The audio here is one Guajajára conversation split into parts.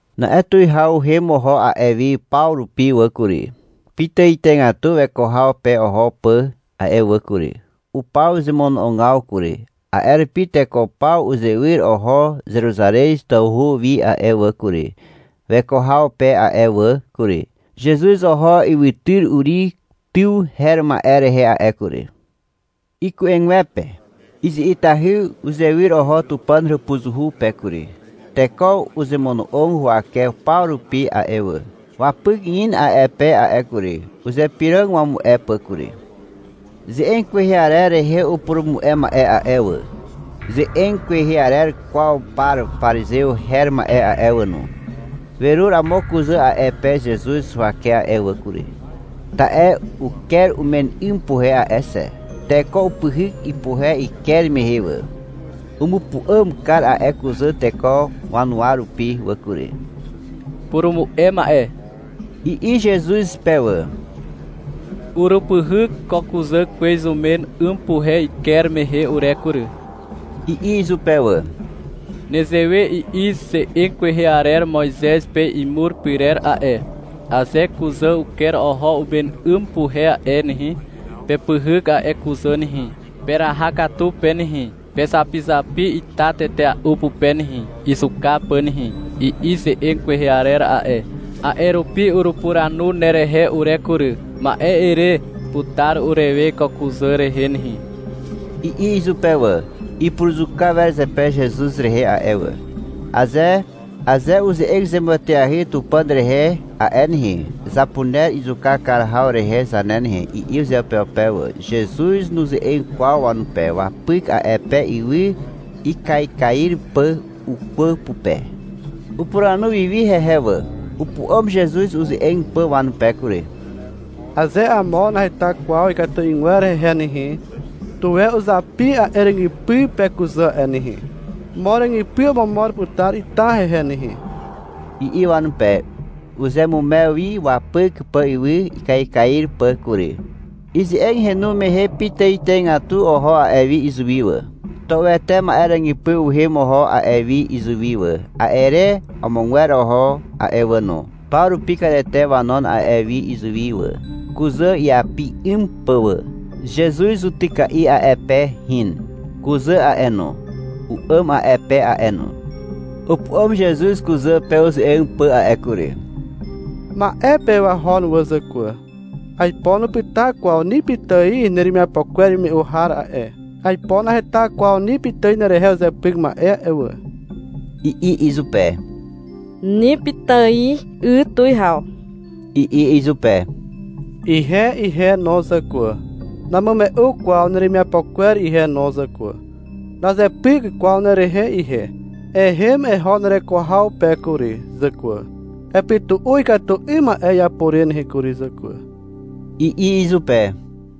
[Na'e tuwihaw uhem oho a'e wi paw rupi wà kury, pitàitàigatu weko haw pe oho pà a'e wà kury. Upaw zemono'ogaw kury. A'e rupi teko paw uzewyr oho Zeruzarez tawhu wi a'e wà kury, weko haw pe a'e wà kury. Zezuz oho ywytyr Uri tyw her ma'e rehe a'e kury. Iku'egwepe izi'itahy uzewyr oho Tupàn hàpuzuhu pe kury. Teko uzemono'og huwake paw rupi a'e wà. Wapyk in a'e pe a'e kury. Uzypyrog wamu'e pà kury. Ze'eg kwehe arer rehe upurumu'e ma'e a'e wà, ze'eg kwehe arer kwaw par parizew her ma'e a'e wà no, werur amo kuzà a'e pe Zezuz huwake a'e wà kury, ta'e uker umen 'ym puhe a'e xe. Teko upyhyk ipuhe iker mehe wà. Umupu'àm kar a'e kuzà teko wanuwa rupi wà kury. — Purumu'e ma'e, i'i Zezuz pe wà. — Urupyhyk ko kuzà kwez umen 'ym puhe iker mehe ure kury, i'i izupe wà. — Nezewe i'i ze'eg kwehe arer Moizez pe imur pyrer a'e. — Aze kuzà uker oho umen 'ym puhe a'e nehe, pepyhyk a'e kuzà nehe, peraha katu pe nehe, pezapizapi ita tetea'u pupe nehe, izuka pà nehe, i'i ze'eg kwehe arer a'e. A'e rupi urupuranu nerehe ure kury. — Ma'e ere putar urewe ko kuzà rehe nehe, i'i izupe wà. Ipuruzuka wer zepe Zezuz rehe a'e wà. — Aze uze'eg zemueteahy Tupàn rehe a'e nehe, zapuner izuka kar haw rehe zane nehe, i'i uzeupeupe wà. Zezuz nuze'eg kwaw wanupe. Wapyk a'e pe ywy ikaikair pà ukwà pupe. Upuranu wi wi hehe wà. Upu'àm Zezuz uze'eg pà wanupe kury. — Aze amo naheta kwaw ikatu 'ygwer hehe nehe, tuwe uzapi a'e ràgypy pe kuzà a'e nehe. Mo ràgypy omomor putar ita hehe nehe, i'i wanupe. Uzeamumew wi wapyk pà ywy ikaikair pà kury. Ize'eg henu mehe pitàitàigatu oho a'e wi izuwi wà. Tua'uete ma'e ràgypy uhem oho a'e wi izuwi wà. A'e re amogwer oho a'e wà no. Paw rupi katete wanon a'e wi izuwi wà, kuzà iapi 'ym pà wà. Zezuz zutyka'i a'e pe hin. Kuzà a'e no, u'àm a'e pe a'e no. Upu'àm Zezuz kuzà pe uze'eg pà a'e kury. — Ma'e pe wahon wà, zàkwà. Aipo nupyta kwaw ni pitài neremiapo kwer imume'u har a'e. Aipo naheta kwaw ni pitài nerehe uzepyk ma'e a'e wà, i'i izupe. — Ni pitài, 'y, tuwihaw, i'i izupe. — Ihe ihe no, zàkwà, namume'u kwaw neremiapo kwer ihe no, zàkwà. Nazepyk kwaw nerehe ihe. Ehem eho nereko haw pe kury, zàkwà. Epytu'u ikatu 'ym ma'e iapo re nehe kury, zàkwà, i'i izupe].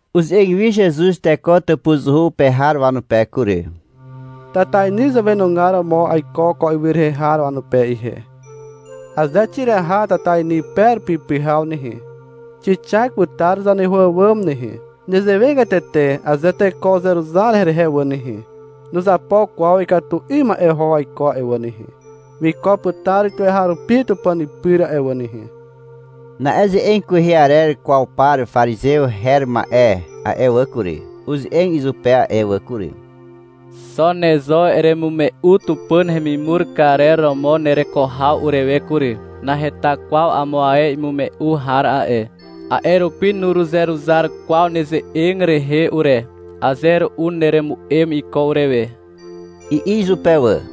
Uze'eg wi Zezuz teko tàpuzuhu pe har wanupe kury. — Tatainy zàwenugar romo aiko ko ywy rehe har wanupe ihe. Aze xiraha tatainy pe rupi pyhaw nehe, xixak putar zaneho àwàm nehe. Nezewegatete aze teko uzeruzar herehe a'e wà nehe, nuzapo kwaw ikatu 'ym ma'e oho waiko a'e wà nehe. Wiko putar tuweharupi Tupàn pyr a'e wà nehe. Na'e ze'eg kwehe arer kwaw par parizew her ma'e a'e wà kury, uze'eg izupe a'e wà kury. — Xo ne zo eremume'u Tupàn hemimur karer romo nereko haw urewe kury. Naheta kwaw amo ae imume'u har a'e, a'e rupi nuruzeruzar kwaw neze'eg rehe ure. Aze ru'u neremu'em iko urewe, i'i izupe wà.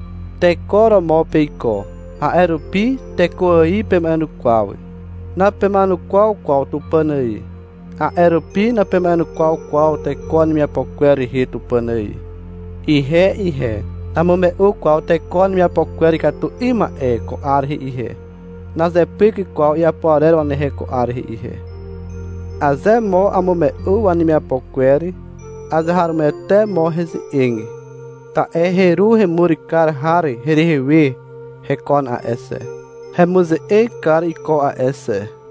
Teko romo peiko, a'e rupi teko ài pema'enukwaw. Napema'enukwaw kwaw Tupàn ài. A'e rupi napema'enukwaw kwaw teko wanemiapo kwer rehe Tupàn ài. Ihe ihe, namume'u kwaw teko wanemiapo kwer ikatu 'ym ma'e ko 'ar rehe ihe. (Nazepyk kwaw iapo arer wanehe ko 'ar rehe.) Aze mo amume'u wanemiapo kwer, azeharomoete mo heze'eg. Ta'e heru hemur kar har herehe we hekon a'e xe, hemuze'eg kar iko a'e xe.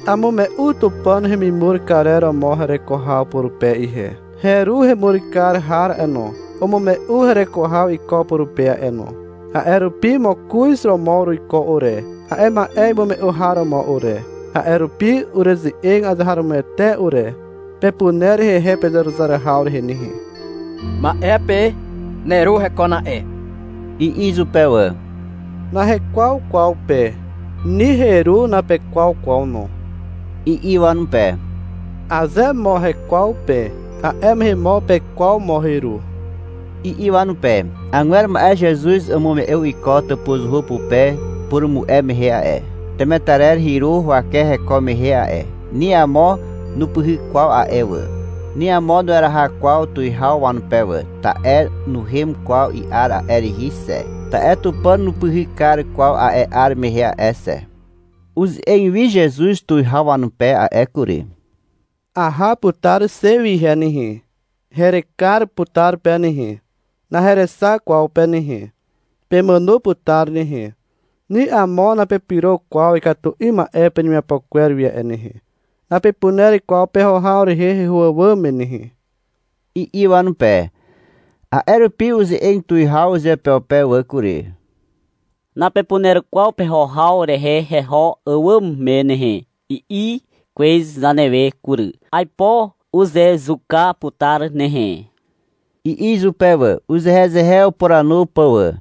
Amume'u Tupàn hemimur karer romo hereko haw purupe ihe. Heru hemur kar har a'e no, umume'u hereko haw iko purupe a'e no. (A'e rupi mokoz romo uruiko ure, a'e ma'e imume'u har romo ure. A'e rupi ureze'eg azeharomoete ure. Pepuner hehe pezeruzar haw rehe nehe.) — Ma'e pe neru hekon a'e, i'i izupe wà. — Nahekwaw kwaw pe, ni heru napekwaw kwaw no, i'i wanupe. — Aze mo hekwaw pe, a'e mehe mo pekwaw mo heru, i'i wanupe. Agwer ma'e Zezuz umume'u iko tàpuzuhu pupe upurumu'e mehe a'e. Temetarer hyru huwake heko mehe a'e. Ni amo nupyhyk kwaw a'e wà. Ni amo nueraha kwaw tuwihaw wanupe wà. Ta'e nuhem kwaw i'ar a'e rihi xe. Ta'e Tupàn nupyhyk kar kwaw a'e 'ar mehe a'e xe. Uze'eg wi Zezuz tuwihaw wanupe a'e kury. — Aha putar xe wi ihe nehe. Herekar putar pe nehe. Naherexak kwaw pe nehe. Pemàno putar nehe. Ni amo napepyro kwaw ikatu 'ym ma'e penemiapo kwer wi a'e nehe. Napepuner kwaw peho haw rehe heho àwàm me nehe, i'i wanupe. A'e rupi uze'eg tuwihaw uzeupeupe wà kury, — Napepuner kwaw peho haw rehe heho àwàm me nehe, i'i kwez zanewe kury. Aipo uzezuka putar nehe, i'i izupe wà, uzehezehe upuranu pà wà.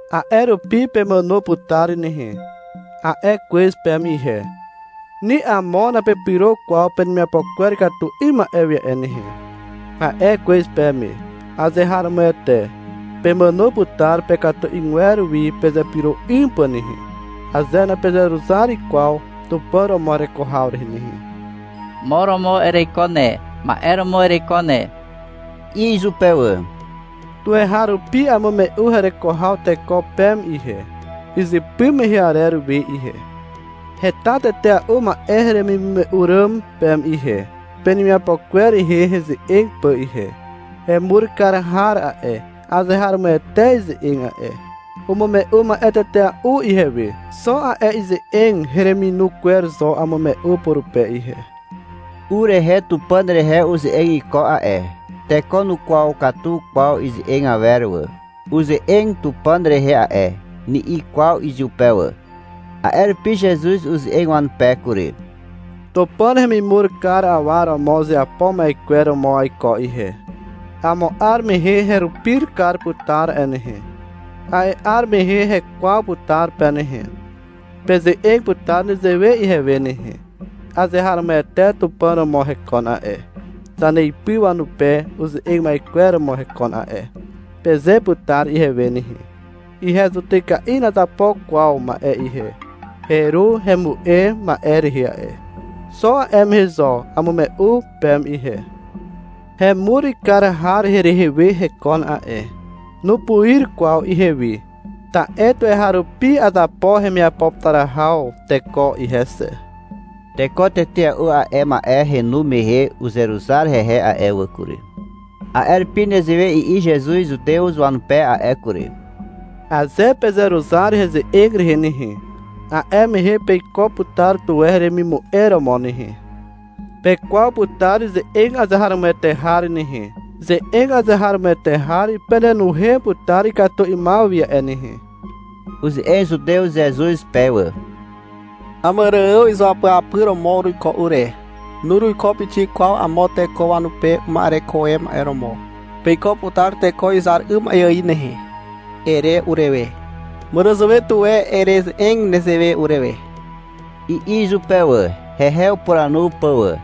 A'e rupi — Pemàno putar nehe, a'e kwez peme ihe. — Ni amo napepyro kwaw penemiapo kwer ikatu 'ym ma'e wi a'e nehe, a'e kwez peme. Azeharomoete, pemàno putar pekatu 'ygwer wi pezepyro 'ym pà nehe, aze napezeruzar kwaw Tupàn romo hereko haw rehe nehe. — Mo romo ereiko ne, ma'e romo ereiko ne, i'i izupe wà. — Tuweharupi amume'u hereko haw teko peme ihe, izypy mehe arer we ihe. Heta tetea'u ma'e heremimume'u ràm peme ihe, penemiapo kwer rehe heze'eg pà ihe. Hemur kar har a'e, azeharomoete ize'eg a'e. Umume'u ma'e tetea'u ihewe. Xo a'e ize'eg hereminu kwer zo amume'u purupe ihe. U rehe Tupàn rehe uze'eg iko a'e. Teko nukwaw katu kwaw ize'eg awer wà. — Uze'eg Tupàn rehe a'e, ni'i kwaw izupe wà. A'e rupi Zezuz uze'eg wanupe kury. — Tupàn hemimur kar awa romo uzeapo ma'e kwer romo aiko ihe. Amo 'ar mehe herupir kar putar a'e nehe. A'e 'ar mehe hekwaw putar pe nehe. Peze'eg putar nezewe ihewe nehe. — Azeharomoete Tupàn romo hekon a'e, zaneipy wanupe uze'eg ma'e kwer romo hekon a'e, peze putar ihewe nehe. Ihe zutyka'i nazapo kwaw ma'e ihe. Heru hemu'e ma'e rehe a'e. Xo a'e ma'e zo amume'u peme ihe. Hemur kar har herehe we hekon a'e. Nupuir kwaw ihewi. Ta'e tuweharupi azapo hemiapo putar haw teko ihe xe. Teko tetea'u a'e ma'e henu mehe uzeruzar hehe a'e wà kury. A'e rupi nezewe i'i Zezuz Zutew wanupe a'e kury. — Aze pezeruzar heze'eg rehe nehe, a'e mehe peiko putar tuwe heremimu'e romo nehe. Pekwaw putar ze'eg azeharomoete har nehe. Ze'eg azeharomoete har penenuhem putar ikatu 'ymaw wi a'e nehe. Uze'eg Zutew Zezuz pe wà. — Àmàrààw izuapyapyr romo uruiko ure. Nuruiko pixik kwaw amo teko wanupe uma'ereko e ma'e romo. — Peiko putar teko izar 'ym ma'e ài nehe, ere urewe. Màràzàwe tuwe ereze'eg nezewe urewe, i'i izupe wà, hehe upuranu pà wà.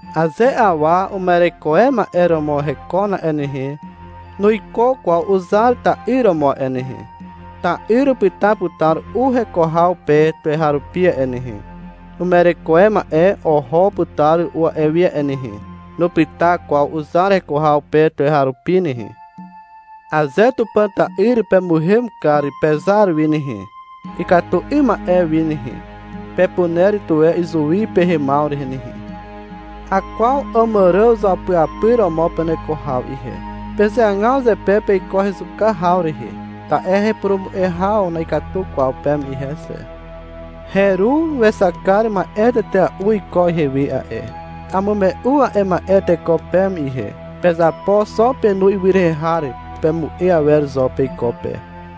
Aze awa uma'ereko e ma'e romo hekon a'e nehe, nuiko kwaw uzar ta'yr romo a'e nehe. Ta'yr upyta putar u heko haw pe tuweharupi a'e nehe. Uma'ereko e ma'e oho putar ru'u a'e wi a'e nehe. Nupyta kwaw uzar heko haw pe tuweharupi nehe. Aze Tupàn ta'yr pemuhem kar pezar wi nehe, ikatu 'ym ma'e wi nehe, pepuner tuwe izuwi pehemaw rehe nehe. Akwaw Àmàrààw izuapyapyr romo peneko haw ihe. Pezeagaw zepe peiko hezuka haw rehe, ta'e hepurumu'e haw na'ikatu kwaw peme ihe xe. Heru wexak kar ma'e tetea'u iko ihewe a'e. Amume'u a'e ma'e teko peme ihe. Pezapo xo penu ywy rehe har pemu'e awer zo peiko pe.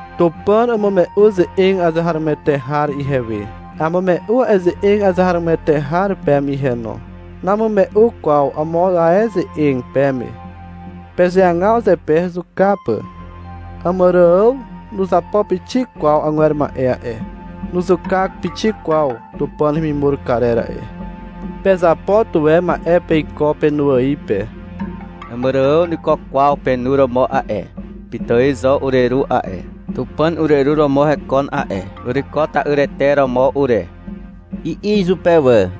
Tupàn umume'u ze'eg azeharomoete har ihewe. Amume'u a'e ze'eg azeharomoete har peme ihe no. Namume'u kwaw amo ae ze'eg peme. Pezeagaw zepe hezuka pà. Àmàrààw nuzapo pixik kwaw agwer ma'e a'e. Nuzuka pixik kwaw Tupàn hemimur karer a'e. Pezapo tuwe ma'e peiko penu ài pe. Àmàrààw nuiko kwaw penu romo a'e. — Pitài zo ureru a'e, Tupàn ureru romo hekon a'e. Uruiko ta'yrete romo ure, i'i izupe wà.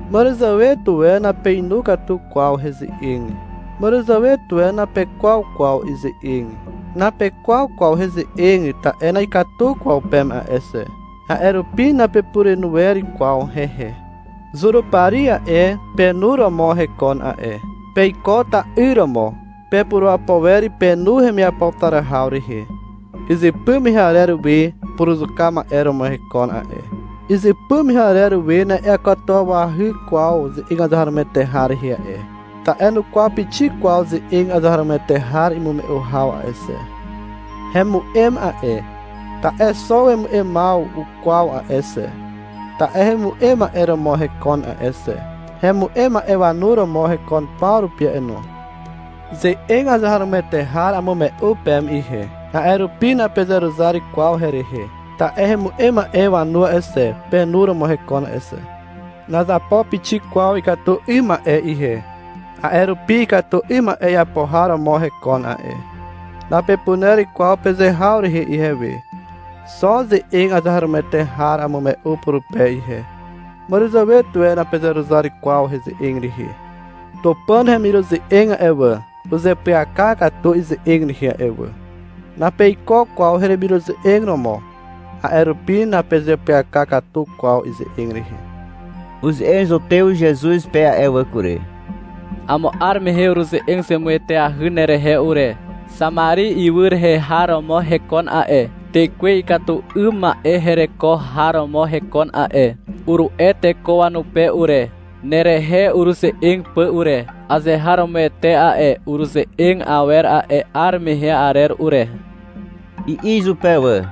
Màràzàwe tuwe napeinu katu kwaw heze'eg. Màràzàwe tuwe napekwaw kwaw ize'eg. Napekwaw kwaw heze'eg ta'e na'ikatu kwaw peme a'e xe, a'e rupi napepurenu wer kwaw hehe. Zurupari a'e, penu romo hekon a'e. Peiko ta'yr romo. Pepurapo wer penu hemiapo putar haw rehe. Izypy mehe arer we puruzuka ma'e romo hekon a'e. Izypy mehe arer we na'iakatuwawahy kwaw ze'eg azeharomoete har rehe a'e, ta'e nukwaw pixik kwaw ze'eg azeharomoete har imume'u haw a'e xe. Hemu'em a'e, ta'e xo wemu'emaw ukwaw a'e xe. Ta'e hemu'em ma'e romo hekon a'e xe. Hemu'em ma'e wanu romo hekon paw rupi no. Ze'eg azeharomoete har amume'u peme ihe. A'e rupi napezeruzar kwaw herehe. Ta'e hemu'em ma'e wanu a'e xe, penu romo hekon a'e xe. Nazapo pixik kwaw ikatu 'ym ma'e ihe. A'e rupi — Ikatu 'ym ma'e iapo har romo hekon a'e, napepuner kwaw peze haw rehe ihewe. Xo ze'eg azeharomoete har amume'u purupe ihe. Màràzàwe tuwe napezeruzar kwaw heze'eg rehe. Tupàn hemiruze'eg a'e wà, uzeapyaka katu ize'eg rehe a'e wà. Napeiko kwaw hemiruze'eg romo. A'e rupi napezeapyaka katu kwaw ize'eg rehe. Uze'eg Zutew Zezuz pe a'e wà kury. — Amo 'ar mehe uruze'eg zemueteahy nerehe ure. — Xamari ywy rehe har romo hekon a'e, tekwe ikatu 'ym ma'e hereko har romo hekon a'e, uru'e teko wanupe ure, nerehe ureze'eg pà ure. Azeharomoete a'e ureze'eg awer a'e 'ar mehe arer ure, i'i izupe wà.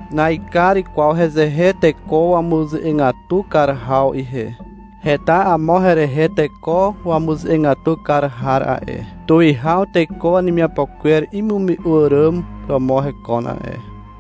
— Naekar kwaw hezehe teko wamuze'egatu kar haw ihe. Heta amo herehe teko wamuze'egatu kar har a'e. Tuwihaw teko wanemiapo kwer imume'u àràm romo hekon a'e.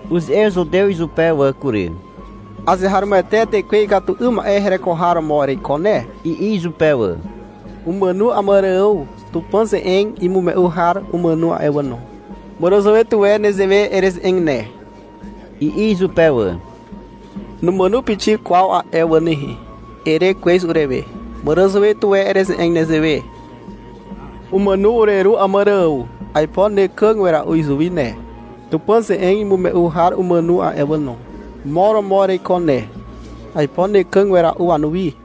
Uze'eg zutew izupe wà kury. — Azeharomoete tekwe ikatu 'ym ma'e hereko har romo ereiko ne, i'i izupe wà. Umàno Àmàrààw. Tupàn ze'eg imume'u har umàno a'e wà no. Màràzàwe tuwe nezewe ereze'eg ne, i'i izupe wà. — Numàno pixik kwaw a'e wà nehe, ere kwez urewe. — Màràzàwe tuwe ereze'eg nezewe. Umàno ureru Àmàrààw. Aipo nekàg wera'u izuwi ne. Tupàn ze'eg imume'u har umàno a'e wà no. Mo romo ereiko ne. Aipo nekàg wera'u wanuwi.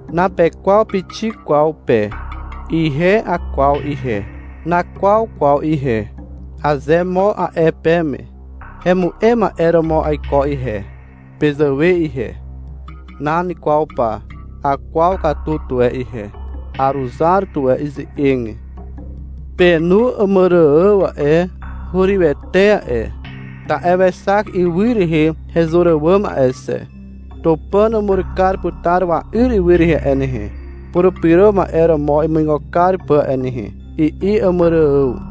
Napekwaw pixik kwaw pe. Ihe akwaw ihe. — Nakwaw kwaw ihe, aze mo a'e peme, hemu'em ma'e romo mo aiko ihe, pezàwe ihe. Nan kwaw pa. Akwaw katu tuwe ihe. Aruzar tuwe ize'eg. Penu Àmàrààw a'e, hurywete a'e, ta'e wexak ywy rehe hezur àwàm a'e xe. — Tupàn umur kar putar wa'yr ywy rehe a'e nehe, Purupyro Ma'e romo imuigo kar pà a'e nehe, i'i Àmàrààw.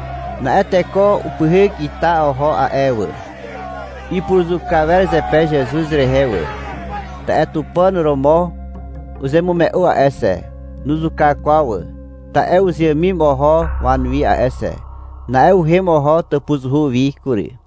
Na'e teko upyhyk ita oho a'e wà. Ipuruzuka wer zepe Zezuz rehe wà, ta'e Tupàn romo uzemume'u a'e xe. Nuzuka kwaw wà, ta'e uzeàmim oho wanuwi a'e xe. Na'e uhem oho tàpuzuhu wi kury.